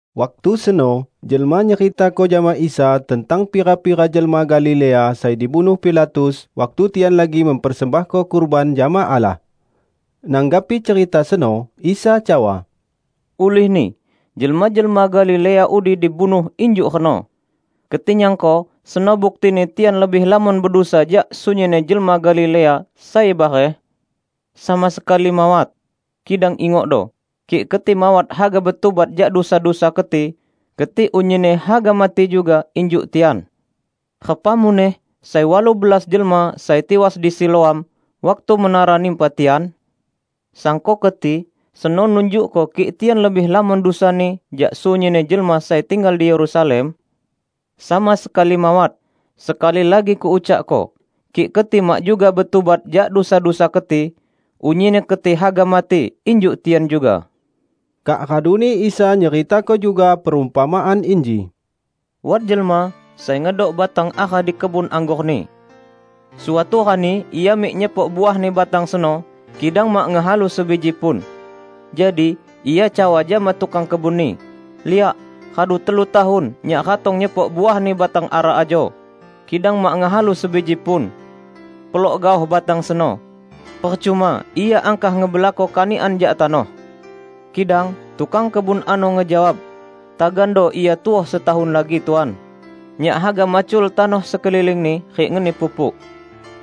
Waktu seno jelma nyeritako jama Isa tentang pira-pira jelma Galilea sai dibunuh Pilatus, waktu tian lagi mempersembahko kurban jama Allah. Nanggapi cerita seno, Isa cawa, "Ulihni jelma-jelma Galilea udi dibunuh injuk reno, keti nyangko seno buktini tian lebih lamon bedusa jak sunyinni jelma Galilea sai bareh? Sama sekali, mawat! Kidang ingokdo: kik keti mawat haga betubat jak dusa-dusa keti, keti unyinni haga mati juga, injuk tian. Repa muneh sai walu belas jelma sai tiwas di Siloam, waktu menara nimpa tian? Sangko keti seno nunjukko kik tian lebih lamon dusani jak sunyinni jelma sai tinggal di Yerusalem? Sama sekali mawat! Sekali lagi Kuucakko: Kik keti mak juga betubat jak dusa-dusa keti, unyinni keti haga mati injuk tian juga." Kak raduni Isa nyeritako juga perumpamaan inji, "Wat jelma sai ngedok batang ara di kebun anggorni. Suatu rani ia mik nyepok uahni batang seno, kidang mak ngehalu sebiji pun. Jadi, ia cawa jama tukang kebunni, 'Liak, radu telu tahun nyak ratong nyepok uahni batang ara ajo, kidang mak ngehalu sebiji pun. Pelok gaoh batang seno! Percuma ia angkah ngebelako kanikan jak tanoh!' Kidang tukang kebun ano ngejawab, 'Tagando ia tuoh setahun lagi Tuan. Nyak haga macul tanoh sekelilingni rik ngeni pupuk.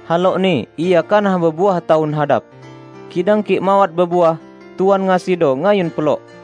Halokni ia kanah bebuah tahun hadap. Kidang kik mawat bebuah, Tuan ngasido ngayun pelok.' "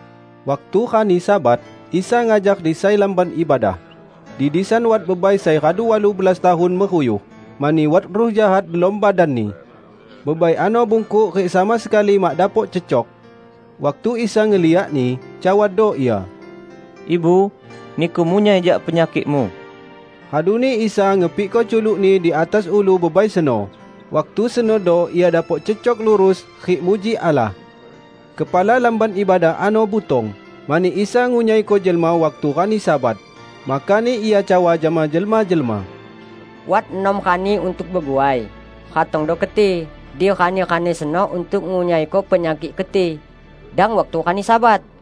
Waktu rani Sabat, Isa ngajar di sai lamban ibadah. Di disan wat bebai sai radu walu belas tahun meruyuh, mani wat ruh jahat delom badanni. Bebai ano bungkuk rik sama sekali mak dapok cecok. Waktu Isa ngeliakni, cawado Ia, "Ibu, niku munyai jak penyakikmu!" Raduni Isa ngepikko culuk-Ni di atas ulu bebai seno, waktu senodo ia dapok cecok lurus rik muji Allah. Kepala lamban ibadah ano butong, mani Isa ngunyaiko jelma waktu rani Sabat, makani ia cawa jama jelma-jelma, "Wat enam rani untuk beguai; ratongdo keti di rani-rani seno untuk ngunyaiko penyakik keti, dang waktu rani Sabat!"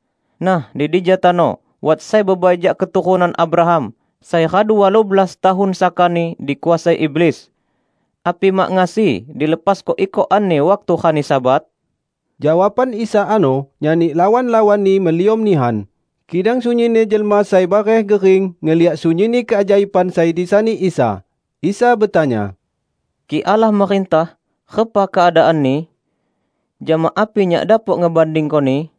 Nah, di dija tano, wat sai bebai jak keturunan Abraham, sai radu walu belas tahun sakani dikuasai iblis. Api mak ngasi dilepasko ikokanni waktu rani Sabat?" Jawaban Isa ano nyani lawan-lawan-Ni meliom nihan; kidang sunyinni jelma sai bareh gering ngeliak sunyinni keajaiban sai disani Isa. Isa betanya, "Kik Allah merintah, repa keadaanni? Jama api Nyak dapok ngebandingkoni?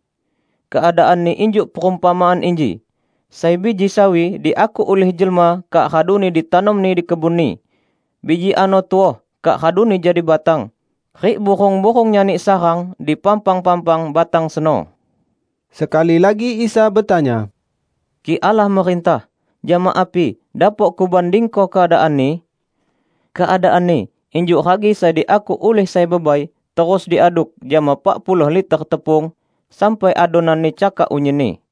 Keadaanni injuk perumpamaan inji. Sai biji sawi diakuk ulih jelma kak raduni ditanomni di kebunni. Biji ano tuoh kak raduni jadi batang, rik burung-burung nyani sarang di pampang-pampang batang seno." Sekali lagi Isa betanya, "Kik Allah merintah, jama api dapok Kubandingko keadaanni? Keadaanni injuk ragi sai diakuk ulih sai bebai terus diaduk jama pak puluh liter tepung, sampai adonanni cakak unyinni."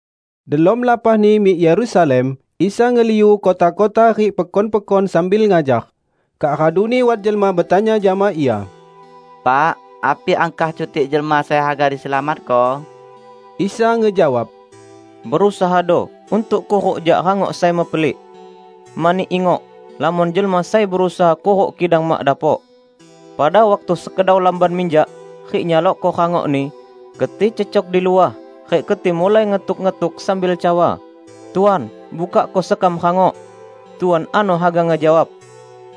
Delom lapahni mik Yerusalem, Isa ngeliu kota-kota rik pekon-pekon sambil ngajar. Kak raduni wat jelma betanya jama Ia, "Pak, api angkah cutik jelma sai haga diselamatko?" Isa ngejawab, "Berusahado untuk kuruk jak rangok sai mepelik. Mani, ingok! Lamon jelma sai berusaha kuruk kidang mak dapok. Pada waktu sekedau lamban minjak rik nyalokko rangokni, keti cecok di luah rik keti mulai ngetuk-ngetuk sambil cawa, 'Tuan, bukakko sekam rangok!' Tuan ano haga ngejawab,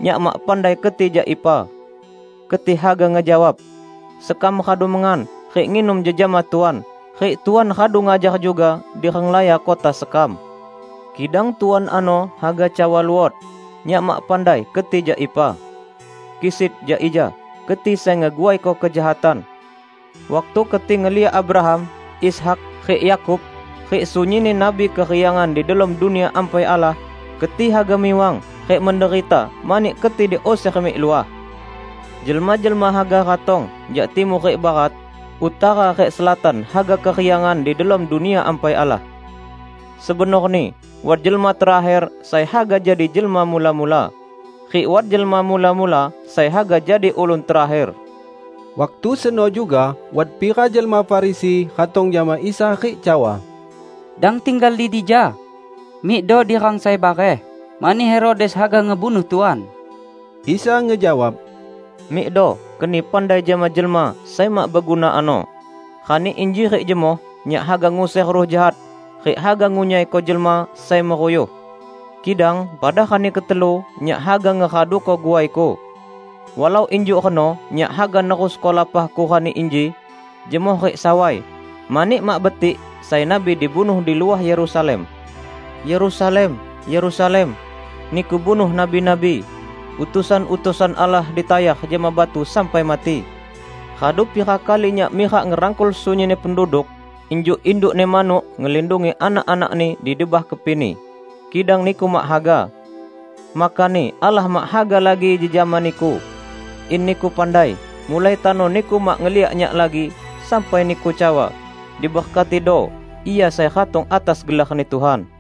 'Nyak mak pandai keti jak ipa!' Keti haga ngejawab, 'Sekam radu mengan rik nginum jejama Tuan, rik Tuan radu ngajar juga di renglaya kota sekam!' Kidang Tuan ano haga cawa luot, 'Nyak mak pandai keti jak ipa. Kisit, jak ija, keti sai ngeguaiko kejahatan!' Waktu keti ngeliak Abraham, Ishak rik Yakub rik sunyinni nabi keriangan di delom Dunia Ampai Allah, keti haga miwang rik menderita mani keti diuser mik luah! Jelma-jelma haga ratong jak timur rik barat, utara rik selatan haga keriangan di delom Dunia Baru Allah. Sebenorni, wat jelma terakher sai haga jadi jelma mula-mula, rik wat jelma mula-mula sai haga jadi ulun terakher." Waktu seno juga, wat pira jelma Farisi ratong jama Isa rik cawa, "Dang tinggal di dija! Mikdo di rang sai bareh, mani Herodes haga ngebunuh Tuan." Isa ngejawab, "Mikdo keni pandai jama jelma sai mak beguna ano, 'Rani inji rik jemoh Nyak haga nguser ruh jahat rik haga ngunyaiko jelma sai meruyuh, kidang pada rani ketelu, Nyak haga ngeraduko guai-Ku.' Walau injuk reno Nyak haga nerusko lapah-Ku rani inji, jemoh rik sawai, mani mak betik sai nabi dibunuh di luah Yerusalem. Yerusalem, Yerusalem! Niku bunuh nabi-nabi! Utusan-utusan Allah ditayar jama batu sampai mati! Radu pira kali Nyak mirak ngerangkul sunyinni penduduk injuk indukni manuk ngelindungi anak-anakni di debah kepini, kidang niku mak haga! Makani Allah mak haga lagi jejama niku. In niku pandai mulai tano niku mak ngeliak Nyak lagi, sampai niku cawa, 'Diberkatido Ia sai ratong atas gelarni Tuhan.' "